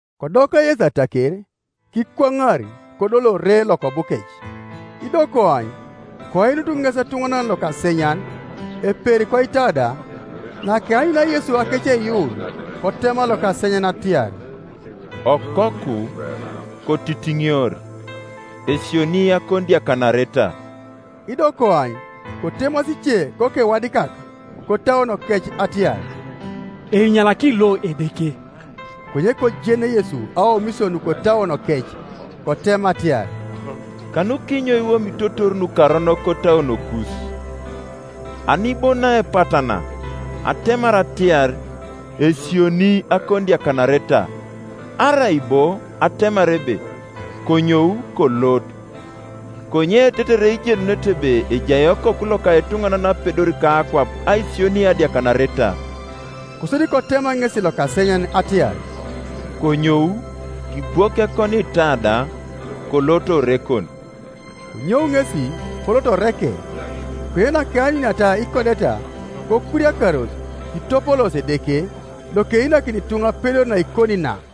Kodoka Yesu ataker, kikwaŋar, kodol ore lokobukec. Ido koany, koinut ŋes etuŋanan lokasenyan, eperi koitada: nakeanyunia Yesu akeceiyuun, kotema lokasenyan atiar, “Okoku, kotitiŋior; esionii akonidiakanareta.” Ido koany, kotemasi ice kokewadikak kotauonokec atiar, “Einyanakini lo Edeke.” Konye kojen Yesu aomisio nukotauonokec, kotema atiar, “Kanukinyo iwomitotor nukaronok kotauonokus? Ani bo naepatana, atemar atiar, Esionii akonidiakanareta, arai bo atemar ebe, Konyou, kolot? Konye tetere ijenunete ebe ejai Okoku loka etuŋanan apedor kakwap aisioni adiakanareta” kosodi kotema ŋesi lokasenyan atiar, “Konyou, kibwok ekoniitada, kolot orekon.” Konyou ŋesi, kolot oreke. Konye nakeanyuniata ikodeta, kokuriakaros, kitopoloosi Edeke, lokeinakini ituŋa apedor naikoni na.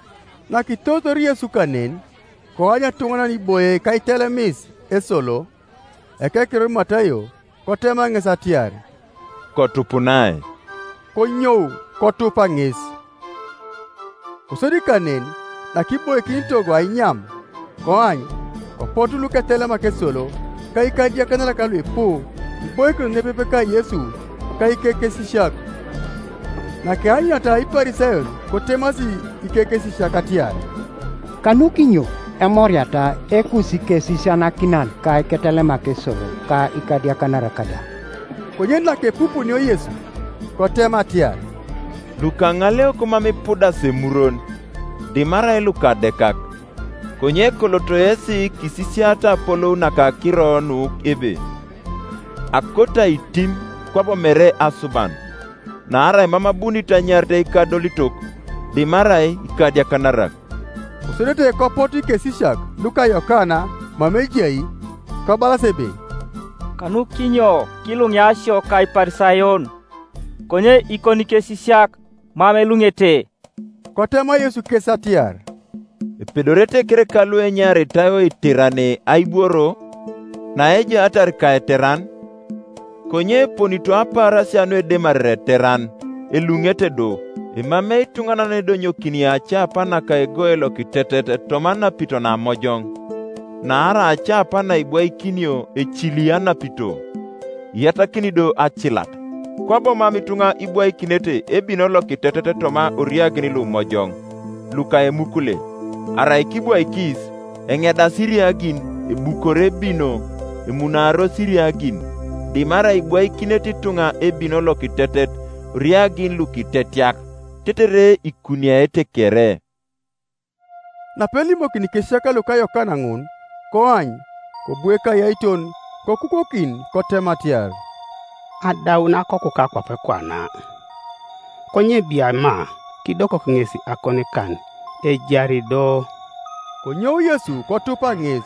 Nakitoritor Yesu kanen, koany etuŋanan iboie kaitelemis esolo, ekekiror Matayo; kotema ŋes atiar, “Kotupunai.” Konyou, kotupa ŋes. Kosodi kanen, nakiboikin togo ainyam, koany, kopotu luketelemak esolo ka ikadiakanarak luipu kiboikinos nepepe ka Yesu ka ikekesisiak. Nakeanyuniata Iparisayon, kotemasi ikekesisiak atiar, “Kanukinyo emoriata Ekusikesisianakinan ka iketelemak esolo ka ikadiakanarak da?” Konye nakepupunio Yesu, kotema atiar, “Lukaŋaleok mam ipudasi emurwon, dimarai lukadekak. Konye koloto yesi kisisiata apolou naka akiro nu ebe, ‘Akoto aitim, kwabo mere asuban.’ Naarai mam abunit anyarit ikadolitok, dimarai ikadiakanarak.” Kosodete kopotu ikesisiak luka Yokana mama ejai, kobalas ebe, “Kanukinyo kilunia isio ka Iparisayon, konye ikonikesisiak mam eluŋete?” Kotema Yesu kes atiar, “Epedorete kereka luenyaritai oiterane aibworo, naeiaarar ka eteran? Konye eponito apaarasia nuedemarere eteran, eluŋete do. Emamei ituŋanan yenedonyokini acana naka egoe lokitetet toma ananito namojoŋ; naarai acana naibwaikinio ecili anapito, iyatakini do acilat. Kwabo mam ituŋa ibwaikinete ebino lokitetet toma oriagin lumojoŋ luka emukule; arai kibwaikis, enedasi iriagin, ebukor ebino, emunaaros iriagin; dimarai ibwaikinete ituŋa ebino lokitetet oriagin lukitetiak, tetere ikuniaete kere.” Napelimokini ikesisiak luka Yokana ŋun, koany, kobu ekayaiton, kokukokin kotema atiar, “Adaun akokuka kwape kwana; konye bia ma kidokok ŋes akonikan, ejari do.” Konyou Yesu kotupa ŋes,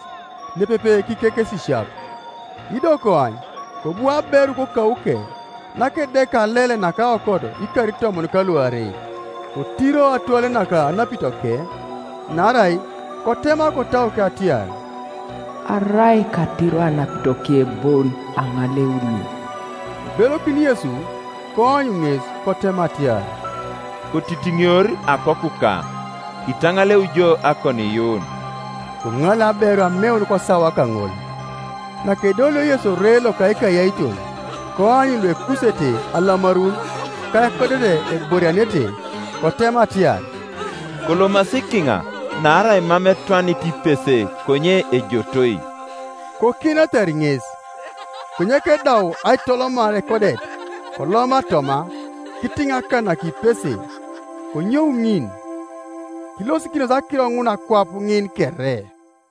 nepepe kikekesisiak. Ido koany, kobu aberu kokauke, nakedeka alel naka aokot ikar itomon ka luarei, kotiro atwele naka anapitoke; naarai kotema kotauke atiar, “Arai katiro anapitoke bon, aŋaleuni.” Kibelokin Yesu, koany ŋes, kotema atiar, “Kotitiŋior akokuka; kitaŋaleu jo akoniiyuun.” Koŋaleu aberu ameun kosawa kaŋol, Nakedolio Yesu ore loka ekayairon, koany luekusere alamarun, ka ekodet eborianete, kotema atiar, “Kolomasi kiŋa; naarai mam etwanit ipese konye ejotoi.” Kokienatar ŋes. Konye kedau aitolomar ekodet, kooma toma, kitiŋ akan naka ipese, konyou ŋin. Kilosikinos akiro ŋun akwap ŋin kere;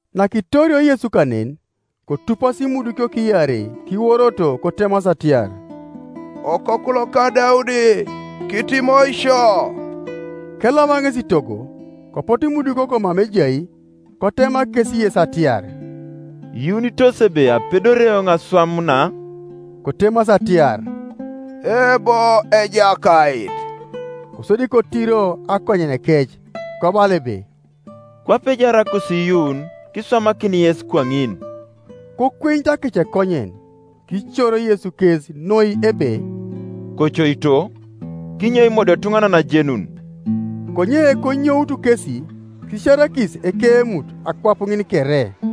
Nakitorio Yesu kanen, kotupasi imudukiok iarei, kiworoto kotemasi atiar, “Okoku loka Daudi, kitimoi sio.” Keloma ŋes itogo, kopotu imudukiok mama ejai; kotema kes Yesu atiar, “Iyuunitos ebe apedori eoŋ aswam na?” Kotemasi atiar, “Eebo, Ejakait.” Kosodi kotiro akonyenekec kobala ebe, “Kwape ejaar akusiiyuun kiswamakin yes kwaŋin.” Kokwenyutu akecekonyen. Kicoro Yesu kes noi ebe, “Kocoito, kinyek imodiotuŋanan ajenun.” Konye konyoutu kesi, kisiarakis ekeemut akwap ŋin kere.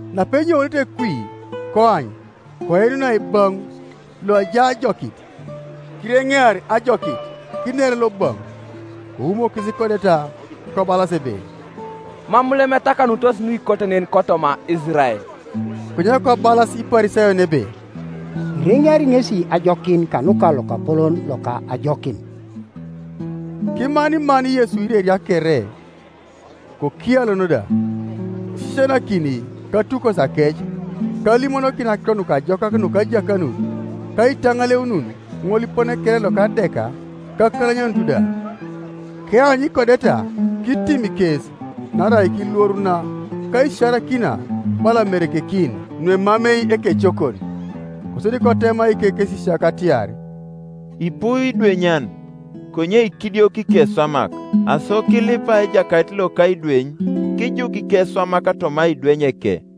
Napenyounete kwi, koany, koinunai ebaŋ loajai ajokit. Kireŋear ajokit kiner lobaŋ; koumokis ikodeta, kobalas ebe, “Mam lem etakanunitos nuikote nen kotoma Isirael.” Konye kobalas Iparisayon ebe, “Ireŋeari ŋesi ajokin kanuka lokapolon loka ajokin.” Kimaniman Yesu ireria kere, kokialon da, isisianakini katukosiakec ka alimonokin Akiro Nukajokak nuka ajakanut, ka aitaŋaleunun ŋolipone kere loka adek ka akalanyanut da. Keanyu ikodeta, kitim kes, naarai kilworuna ka aisiarakina, bala amerekekin nuemamei ekecokon. Kosodi kotema ikekesisiak atiar, “Ipu idwenyan, konye ikidioko ikeswamak; aso kilipa Ejakait loka aidweny kijuk ikeswamak toma aidwenyeke.”